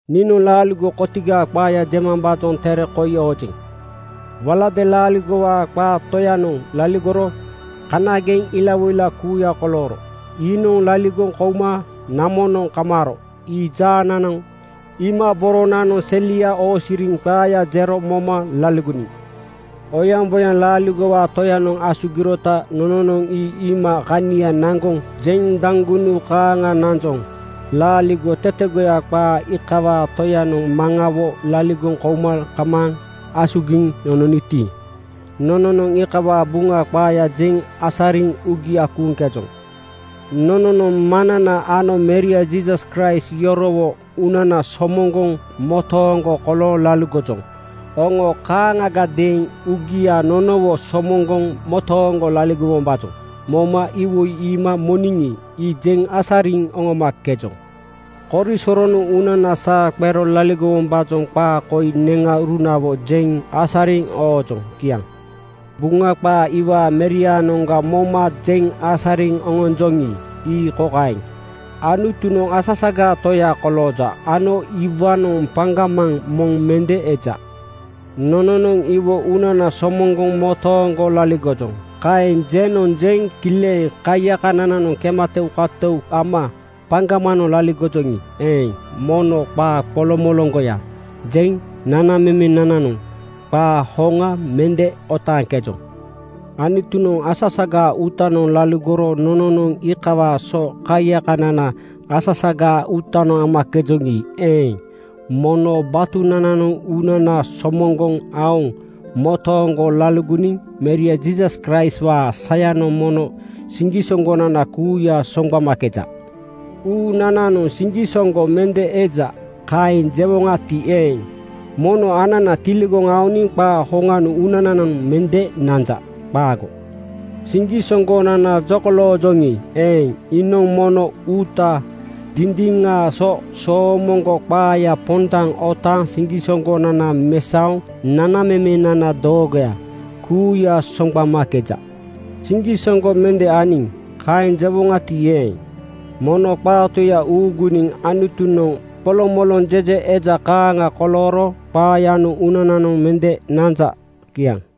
Niinoŋ laaligo kotigaa qaaya jemambaajoŋ tere koi oojeŋ. Waladeeŋ laaligowaa qaa Toyanoŋ laligorogo kanageŋ ilawoila kuuya kolooro. Iinoŋ laligoŋ kouma namonoŋ kamaaro ii jaanananoŋ iima boronananoŋ selia oosiriniŋ qaaya jero moma laligoniŋ. Oyaŋboyaŋ laaligowaa Toyanoŋ asugirota nononoŋ ii iima kania naŋgoŋ jeŋ daŋgunu kaaŋa nanjoŋ. Laaligo tetegoya qaa iikawaa Toyanoŋ Maŋawo laligoŋ kouma kamaaŋ asugiŋ nononoti, nononoŋ iikawaa Buŋa qaaya jeŋ asariŋ uugia kuuŋkejoŋ. Nononoŋ Maŋnana ano Meria Jiisas Kraist yorowo uunana somoŋgoŋ motooŋgo kolooŋ laligojoŋ. Oŋo kaaŋagadeeŋ uugia nonowo somoŋgoŋ motooŋgo laligowombaajoŋ moma iwoi iima moniŋi, ii jeŋ asariŋ oŋomakejoŋ. Korisoronoŋ uunana saa qero laligowombaajoŋ qaa koi neŋaurunawo jeŋ asariŋ oojoŋ. Kiaŋ. Buŋa qaa iwaa Meriaanoŋga moma jeŋ asariŋ oŋonjoŋi, ii kokaeŋ: Anutunoŋ asasagaa Toya kolooja ano iwaanoŋ paŋgamaŋ moŋ mende eja. “Nononoŋ iwo uunana somoŋgoŋ motooŋgo laligojoŋ,” kaeŋ jenoŋ jeŋ kileŋ kaiyakanananoŋ kematoukantou ama paŋgamanoŋ laligojoŋi eeŋ, mono qaa qoloŋmoloŋgoya jeŋ nanamemenananoŋ qaa hoŋa mende otaaŋkejoŋ. Anutunoŋ asasagaa uutanoŋ laligoro nononoŋ iikawaa so kaiyakanana asasagaa uutanoŋ amakejoŋi eeŋ, mono batunananoŋ uunana somoŋgoŋ aoŋ motooŋgo laligoniŋ Meria Jiisas Kraistwaa sayanoŋ mono siŋgisoŋgonana kuuya soŋgbamakeja. “Uunananoŋ siŋgisoŋgo mende eja,” kaeŋ jewonagati eeŋ, mono anana tiligoŋ aoniŋ qaa hoŋanoŋ uunananoŋ mende nanja. Qaago! Siŋgisoŋgonana jokoloojoŋi eeŋ, iinoŋ mono uuta dindiŋaa so soomoŋgo qaaya pondaŋ otaaŋ siŋgisoŋgonana mesaoŋ nanamemenana doogoya kuuya soŋgbamakeja. “Siŋgisoŋgo mende aniŋ,” kaeŋ jewoŋati eeŋ, mono qaa Toya uuguniŋ Anutunoŋ qolomoloŋ jeje eja kaaŋa kolooro qaayanoŋ uunananoŋ mende nanja. Kiaŋ.